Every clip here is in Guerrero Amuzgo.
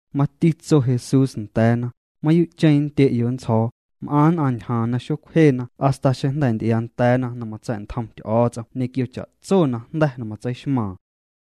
Mati tso Jesús nda̱a̱na: —Mayuu'cheⁿ nndye'yo' nntsjo̱o̱, m'aⁿ nn'aⁿ ñjaaⁿ na xocwjena hasta xeⁿ jnda̱ nty'iaanda̱a̱na na matsa̱'ntjom Ty'o̱o̱ts'om ñequio cha'tso najnda̱ na matseixmaaⁿ.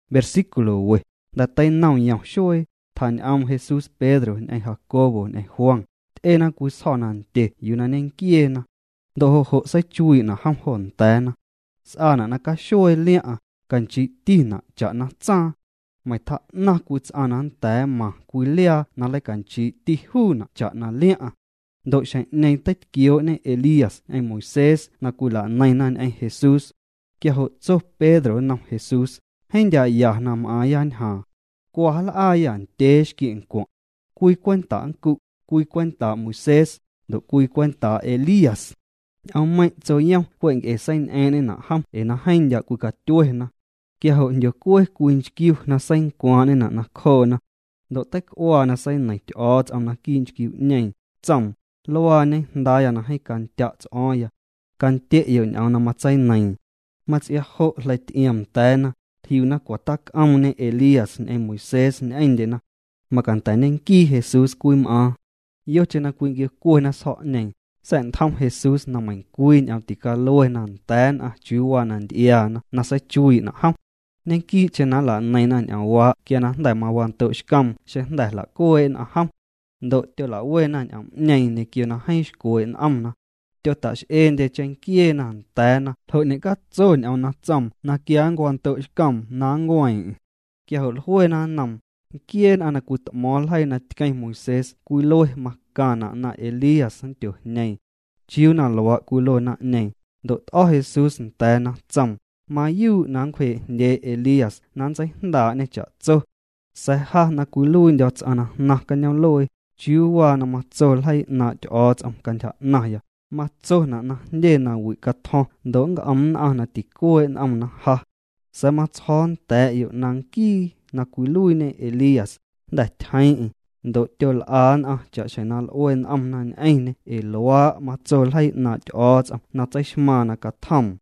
Jnda̱ na teinom yom xuee, tjañ'oom Jesús Pedro ñ'eⁿ Jacobo ñ'eⁿ Juan. Ty'ena cwii sjo̱ nandye yuu na ñenquieena. Ndo' jo' jo' seichuii'na' jom jo nda̱a̱na. S'aana' na caxuee liaⁿ'aⁿ, canchii'tina' cha'na tsaaⁿ. Meiⁿ tjaa'naⁿ cwii ts'aⁿ na nnda̱a̱ mmaⁿ cwii liaa na nleicanchii'ti juuna' cha'na liaⁿ'aⁿ. Ndo' xjeⁿ'ñeeⁿ teitquioo'ñe Elías ñ'eⁿ Moisés na cwila'neiⁿna ñ'eⁿ Jesús. Quia jo' tso Pedro nnom Jesús: —Jeeⁿ ndya' ya na m'aaⁿya ñjaaⁿ. Cwa, nl'aayâ ndyee xquie' ncwaⁿ'. Cwii cwenta' nncu', cwii cwentaa' Moisés, ndo' cwii cwentaa' Elías. Ñ'oommeiⁿ' tsoyom cwe' nc'e na seiñ'eeⁿ'ñ'eⁿna' jom ee na jeeⁿ ndya' cwicatyuena. Quia jo' jndyocue cwii nchquiu na seincwaaⁿ'ñena' nacjoona. Ndo' teic'uaa na seineiⁿ Ty'o̱o̱ts'om naquii' nchquiu'ñeeⁿ, tsoom: —Luaañe Jndaaya na jeeⁿ candya' ts'o̱o̱ⁿya. Candye'yo' ñ'oom na matseineiiⁿ. Mats'iaa jo' quia jleity'iomnda̱a̱na, jliuna cwa tac'oomñe Elías ñ'eⁿ Moisés ñ'eⁿndyena. Macanda̱ ñenquii Jesús cwim'aaⁿ. Yocheⁿ na cwinquiocuena sjo̱'ñeeⁿ, sa̱'ntjom Jesús na meiⁿcwii ñ'oom ticaluena nda̱a̱ nn'aⁿ chiuu waa na nty'iaana na seichuii'na' jom. Ñequii'cheⁿ na nla'neiⁿna ñ'oomwaa' quia jnda̱ mawando'xcoom xeⁿ jnda̱ jla'cuee' nn'aⁿ jom. Ndo' tyola'wena ñ'oom'ñeeⁿ ñequio na jeeⁿ xcwee' n'omna. Tyota'x'eendye cheⁿnquieena nda̱a̱na ljo' ñecatso ñ'oom na tsoom na quia nncwando'xcoom na nncueeⁿ'eⁿ. Quia jo' jluena nnoom: —Nquiee nn'aⁿ na cwit'mo̱o̱ⁿ ljeii na tqueⁿ Moisés cwilue macaⁿna' na Elías nndyojñeeⁿ. —¿Chiuu na luaa' cwilue naⁿ'ñeeⁿ? Ndo' t'o̱ Jesús nda̱a̱na tsoom: —Mayuu' na ncwjee'jndyee Elías na nntseijndaa'ñê cha'tso. Sa̱a̱ ja na cwiluiindyo̱ ts'aⁿ na jnaⁿ cañoom'luee, ¿chiuu waa na matso ljeii 'naaⁿ' Ty'o̱o̱ts'om cantyja 'naⁿya? Matsona' na jndye nawi' catjo̱ⁿ ndo' nnc'om nn'aⁿ na ticuee' n'omna ja. Sa̱a̱ matsjo̱o̱ nda̱a̱'yo' na nquii na cwiluiiñe Elías, jnda̱ tyjeeⁿ'eⁿ, ndo' tyol'a nn'aⁿ cha'xjeⁿ na l'ue n'omna ñ'eⁿñê ee luaa' matso ljeii 'naaⁿ' Ty'o̱o̱ts'om na tseixmaaⁿ na catjoom.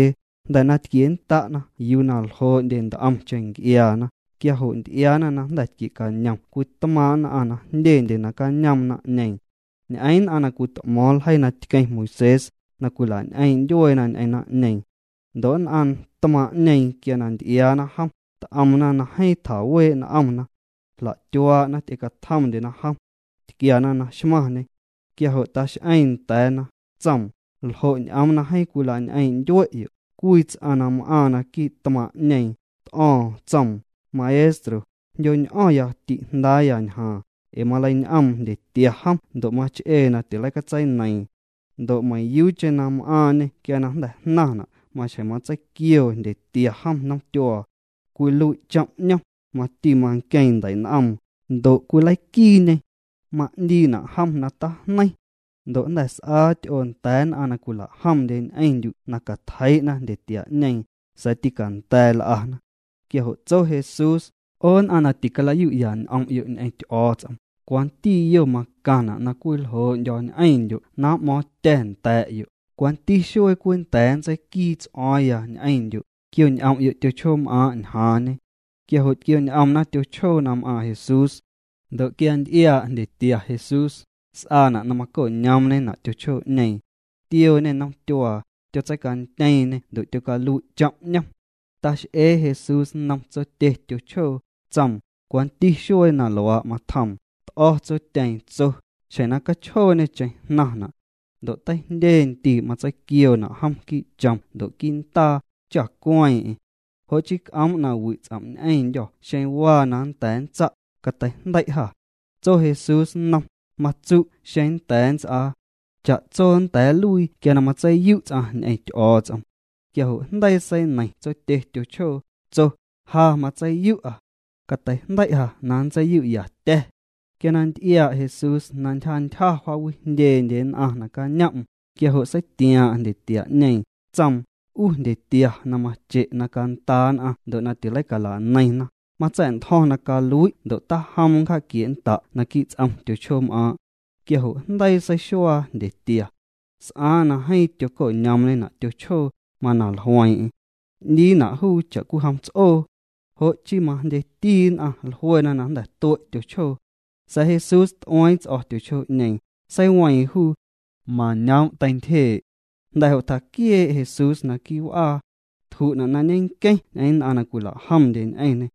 Jnda̱ na tquiennda'na yuu ljoo'ndye nt'omcheⁿ nc'iaana, quia jo' nty'iaana na jnda̱ tquie'cañom cwii tmaaⁿ' nn'aⁿ na jndyendye nacañoom naⁿ'ñeeⁿ. Ñ'eeⁿ nn'aⁿ na cwit'mo̱o̱ⁿ ljeii na tqueⁿ Moisés, na cwila'ñ'eeⁿ' ndyueena ñ'eⁿ naⁿ'ñeeⁿ. Ndo' nn'aⁿ tmaaⁿ'ñeeⁿ quia na nty'iaana jom, t'omna na jeeⁿ tjawee' n'omna. Jla'tyuaa'na, ty'ecatjomndyena jom. Tquiana na xmaⁿñê. Quia jo' tax'eeⁿ nda̱a̱na, tsoom: —¿Ljo' ñ'oom na jeeⁿ cwilañ'eeⁿ' ndyuee'yo'? Cwii ts'aⁿ na m'aaⁿ naquii' tmaaⁿ' naⁿ'ñeeⁿ, t'o̱o̱ⁿ. Tsoom: —Maestro, jndyo̱ñ'o̱ⁿya ti'jndaaya ñjaaⁿ, ee maleiñ'oom jndyetia jom ndo' mach'ee na tileicatseineiiⁿ. Ndo' meiⁿyuucheⁿ na m'aaⁿñê quia jnda̱ jnaⁿna' maxjeⁿ matseiquioo jndyetia jom nomtyuaa. Cwilui' chom' 'ñom, mati manqueeⁿ ndei'n'oom, ndo' cwileiquiiñê. Ma'ndiina' jom na tajneiⁿ. Ndo' jnda̱ s'aa ty'oo nda̱a̱ nn'aⁿ na cwila'jomndye ñ'eⁿndyu' na catjeii'na jndyetia'ñeeⁿ, sa̱a̱ tîcanda̱a̱ l'ana. Quia jo' tso Jesús: —'O nn'aⁿ na ticala'yu'ya' n'om'yo' ñ'eⁿ Ty'o̱o̱ts'om, ¿cwanti yo macaⁿna' na cwii nljoo'ndyo̱ ñ'eⁿndyo' na m'mo̱o̱ⁿtya̱ nda̱a̱'yo'? ¿Cwanti xuee cwii nnda̱a̱ nntseiquii ts'o̱o̱ⁿya ñ'eⁿndyo'? Quio'ñ'om'yo' tyochjoom'aaⁿ' ñjaaⁿñe. Quia jo' tquioñ'omna tyochjoo na m'aaⁿ Jesús. Ndo' quia nty'iaa' jndyetia Jesús, s'aana' na tyocoñoomñena' tyochjoo'ñeeⁿ. Tiooñê nomtyuaa, tyotseicantyeeⁿñê ndo' tyocalui' chom' 'ñom. Ta'x'ee Jesús nnom tsotye tyochjoo, tsoom: —¿Cwanti xuee na luaa' matjoom? T'o̱ tsotyeeⁿ, tso: —Xjeⁿ na cachjooñêcheⁿ jnaⁿna'. Ndo' teijndye ndii' matseiquioona' jom quii' chom ndo' quii' ndaa, cha cueeⁿ'eⁿ. Jo' chii c'oom' na wi' ts'om' ñ'eⁿndyô̱ xeⁿ waa na nnda̱a̱ nntsa', cateijndei' jâ. Tso Jesús nnom: —Matsu' xeⁿ nnda̱a̱ nts'aa. Cha'tso nnda̱a̱ nluii quia na matseiyu' ts'aⁿ ñ'eⁿ Ty'o̱o̱ts'om. Quia jo' jndeii seineiⁿ tsotye tyochjoo, tso: —Ja matseiyu'a. Cateijndei' ja na nntseiyu'yatya̱. Quia na nty'iaa' Jesús na ntyjantyja jaawijndyendye nn'aⁿ nacañom'm, quia jo' seitiaaⁿ'aⁿ jndyetia'ñeeⁿ, tsoom: —'U jndyetia na mache' na cantaa nn'aⁿ ndo' na tileicala'neiⁿna, matsa̱'ntjo̱ⁿ na calui' ndo' tajom nncja'quie'nnda' naquii' ts'om tyochjoom'aaⁿ'. Quia jo' jndeii seixuaa jndyetia. S'aaⁿ na jeeⁿ tyoco'ñoomñena' tyochjoo, mana jlueeⁿ'eⁿ. 'Ndiina' juu cha'cwijom ts'oo. Jo' chii majndyeti nn'aⁿ jluena na jnda̱ tue' tyochjoo. Sa̱a̱ Jesús t'ueeⁿ ts'o̱ tyochjoo'ñeeⁿ, seiweeⁿ juu. Mañoom' teintyjee'. Jnda̱ jo' tjaquiee' Jesús quii' w'aa. Tju'na' na ñenqueⁿ ñ'eⁿ nn'aⁿ na cwila'jomndye ñ'eⁿñê.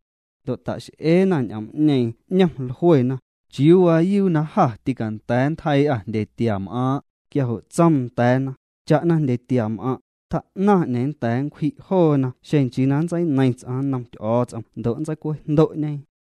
Ndo' ta'x'eena ñ'oom'ñeeⁿ 'ñom, jluena: —¿Chiuu waayuu na jâ tîcanda̱a̱ nntjeii'â jndyetiam'aaⁿ'? Quia jo' tsoom nda̱a̱na: —Cha'na jndyetiam'aⁿ', tjaa'naⁿ 'neeⁿ nnda̱a̱ nncwji' joona xeⁿ nchii na nntseineiⁿ ts'aⁿ nnom Ty'o̱o̱ts'om ndo' na nntseicwejndo'ñe.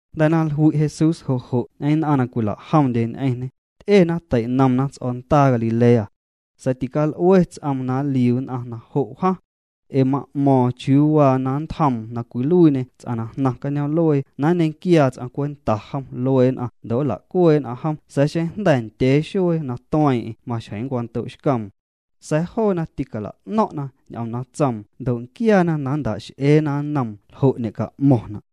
Jnda̱ na jlui' Jesús jo' jo' ñ'eⁿ nn'aⁿ na cwila'jomndye ñ'eⁿñê, ty'ena, teinomna ts'o̱ndaa Galilea. Sa̱a̱ tical'ue ts'oom na nliu nn'aⁿ na jo' wjaⁿ. Ee ma'mo̱o̱ⁿ chiuu waa na nntjoom na cwiluiiñê ts'aⁿ na jnaⁿ cañoom'luee na nñequiaa ts'aⁿ cwenta jom luee nn'aⁿ ndo' nla'cuee' jom sa̱a̱ xeⁿ jnda̱ ndyee xuee na tueeⁿ'eⁿ maxjeⁿ nncwando'xcoom. Sa̱a̱ joona ticala'no̱ⁿ'na ñ'oom na tsoom ndo' nquiaana na nnta'x'eena nnoom ljo' ñe'ca'mo̱ⁿna'.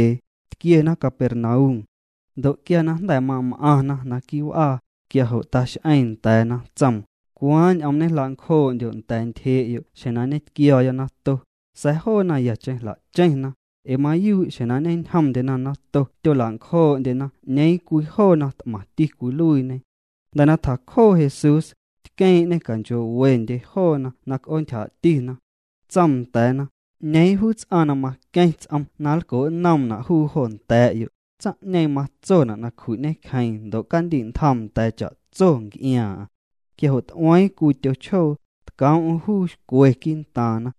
Tquiena Capernaum. Ndo' quia na jnda̱ mam'aⁿna quii' w'aa, quia jo' tax'eeⁿ nda̱a̱na, tsoom: —¿Cwaaⁿ ñ'oom ñejla'ncjoo'ndyo' nda̱a̱ ntyjee'yo' xjeⁿ na ñetquio̱o̱ya nato? Sa̱a̱ joona yacheⁿ jla'cheⁿna, ee mayuu' xjeⁿ na ñeñjomndyena nato tyola'ncjoo'ndyena 'ñeeⁿ cwii joona t'maⁿti cwiluiiñe. Jnda̱ na tjacjoo Jesús, tqueeⁿ'ñê canchoo'wendye joona na c'oontyjaa'tina. Tsoom nda̱a̱na: —'Ñeeⁿ juu ts'aⁿ na maqueⁿ ts'om na nlco'nnomna' juu jo nda̱a̱'yo', tsaⁿ'ñeeⁿ matsona' na cju'ñecjeeⁿ ndo' candi'ntjoom nda̱a̱ cha'tso nc'iaaⁿ'aⁿ. Quia jo' t'ueeⁿ cwii tyochjoo, tcoom'm juu xcwe quii'ntaaⁿna.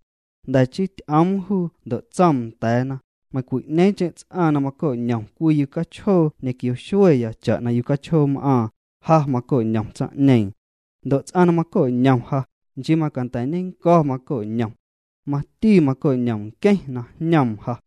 Jnda̱ chii ty'oom juu ndo' tsoom nda̱a̱na: —Meiⁿcwi'ñeeⁿcheⁿ ts'aⁿ na maco'ñom cwii yucachjoo ñequio xueya cha'na yucachjoom'aaⁿ, ja maco'ñom tsaⁿ'ñeeⁿ. Ndo' ts'aⁿ na maco'ñom ja, nchii macanda̱ ñennco̱ maco'ñom. Mati maco'ñom nqueⁿ na jñoom ja.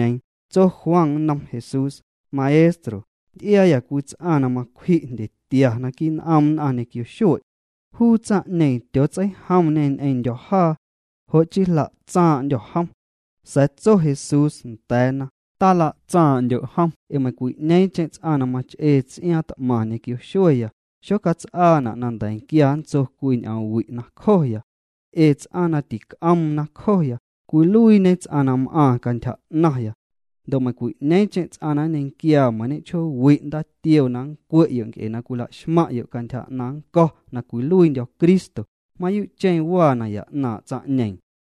Tso Juan nnom Jesús: —Maestro, nty'iaayâ cwii ts'aⁿ na macwji' jndyetia naquii' n'om nn'aⁿ ñequio xue'. Juu tsaⁿ'ñeeⁿ tyootseijomñê ñ'eⁿndyo̱ jaa. Jo' chii jla'tsaaⁿ'ndyô̱ jom. Sa̱a̱ tso Jesús nda̱a̱na: —Tala'tsaaⁿ'ndyo' jom ee meiⁿcwi'ñeeⁿcheⁿ ts'aⁿ na mach'ee ts'iaaⁿ t'maⁿ ñequio xueya, xocats'aana' na nda̱nquia nntso cwii ñ'oom wi' nacjoya. Ee ts'aⁿ na tic'oom nacjoya, cwiluiiñe ts'aⁿ na m'aaⁿ cantyja 'naⁿya. Ndo' meiⁿcwi'ñeeⁿcheⁿ ts'aⁿ na nñequiaa meiⁿ ñechjoowi' ndaatioo na nncwe'yo' nc'e na cwilaxmaⁿ'yo' cantyja 'naⁿ nnco̱ na cwiluiindyo̱ Cristo, mayuu'cheⁿ waa naya 'naaⁿ' tsaⁿ'ñeeⁿ.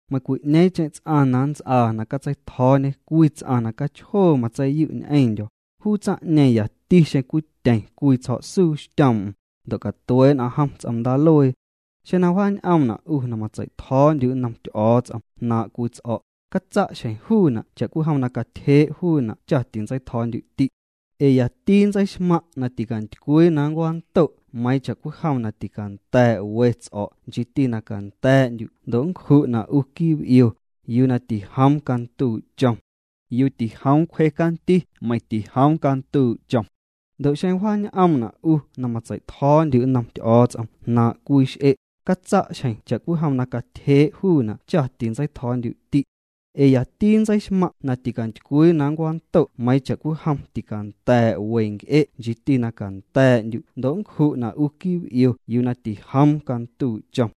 ’Meiⁿcwi'ñeeⁿcheⁿ ts'aⁿ na nts'aa na catseitjo̱o̱ñe cwii ts'aⁿ na cachjoo matseiyu' ñ'eⁿndyo̱, juu tsaⁿ'ñeeⁿ yati xeⁿ cwityeⁿ cwii tsjo̱'suu xtyoom'm, ndo' catuee' nn'aⁿ jom ts'om ndaaluee. Xeⁿ na wjaañ'oomna' 'u na matsei'tjo̱o̱ndyu' nnom Ty'o̱o̱ts'om jnaaⁿ' cwii ts'o̱', catsa' xjeⁿ juuna' cha'cwijom na catyjee' juuna' cha tintsei'tjo̱o̱ndyu'ti'. Ee yati nntseixmaⁿ' na ticantycwii na nncwando' meiiⁿ cha'cwijom na ticanda̱a̱' we ts'o̱' nchiiti na canda̱a̱'ndyu' ndo' nncju'na' 'u quii' b'io yuu na tijoom canduu' chom. Yuu tijoom cwje canti meiⁿ na nnduu' chom. Ndo' xeⁿ wjaañ'oomna' 'u na matsei'tjo̱o̱ndyu' nnom Ty'o̱o̱ts'om jnaaⁿ' cwii x'e', catsa' xjeⁿ cha'cwijom na catyjee' juuna' cha tintsei'tjo̱o̱ndyu'ti'. Ee yati nntseixmaⁿ' na ticantycwii na nncwando' meiiⁿ cha'cwijom ticanda̱a̱' we nc'e' nchiiti na canda̱a̱'ndyu' ndo' nncju'na' 'u quii' b'io yuu na tijoom canduu' chom.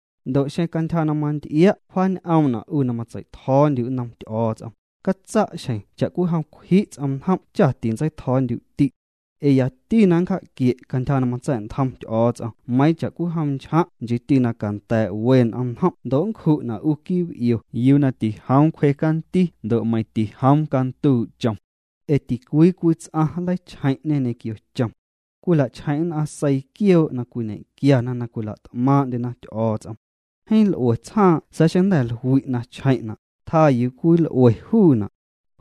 Ndo' xeⁿ cwe' cantyja na manty'ia' wjaañ'oomna' 'u na matsei'tjo̱o̱ndyu' nnom Ty'o̱o̱ts'om, catsa' xjeⁿ cha'cwijom na cwji' ts'omnjom' cha tintsei'tjo̱o̱ndyu'ti'. Ee yati na nncja'quie' cantyja na matsa̱'ntjom Ty'o̱o̱ts'om meiiⁿ cha'cwijom na nchjaⁿ' nchiiti na canda̱a̱' we n'omnjom' ndo' nncju'na' 'u quii' b'io yuu na tijoom cwje canti ndo' meiⁿ na nnduu' chom. ’ Ee ticwii cwii ts'aⁿ nleichjeⁿ'ñê ñequio chom. Cwila'chjeⁿ' nn'aⁿ seii quioo' na cwiñe'quiana na cwila't'maaⁿ'ndyena Ty'o̱o̱ts'om. Jeeⁿ l'ue tsjaaⁿ' sa̱a̱ xeⁿ jnda̱ jlui' na chjeⁿ'na', tjaa yuu cwii nl'ue juuna'.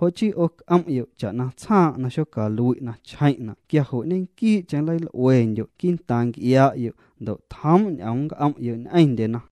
Jo' chii 'o c'om'yo' cha'na tsjaaⁿ' na xocalui' na chjeⁿ'na' quia jo' ñenquii'cheⁿ nleil'uendyo' quii'ntaaⁿ nc'ia'yo' ndo' tjoom' ñ'oom nnc'om'yo' ñ'eⁿndyena.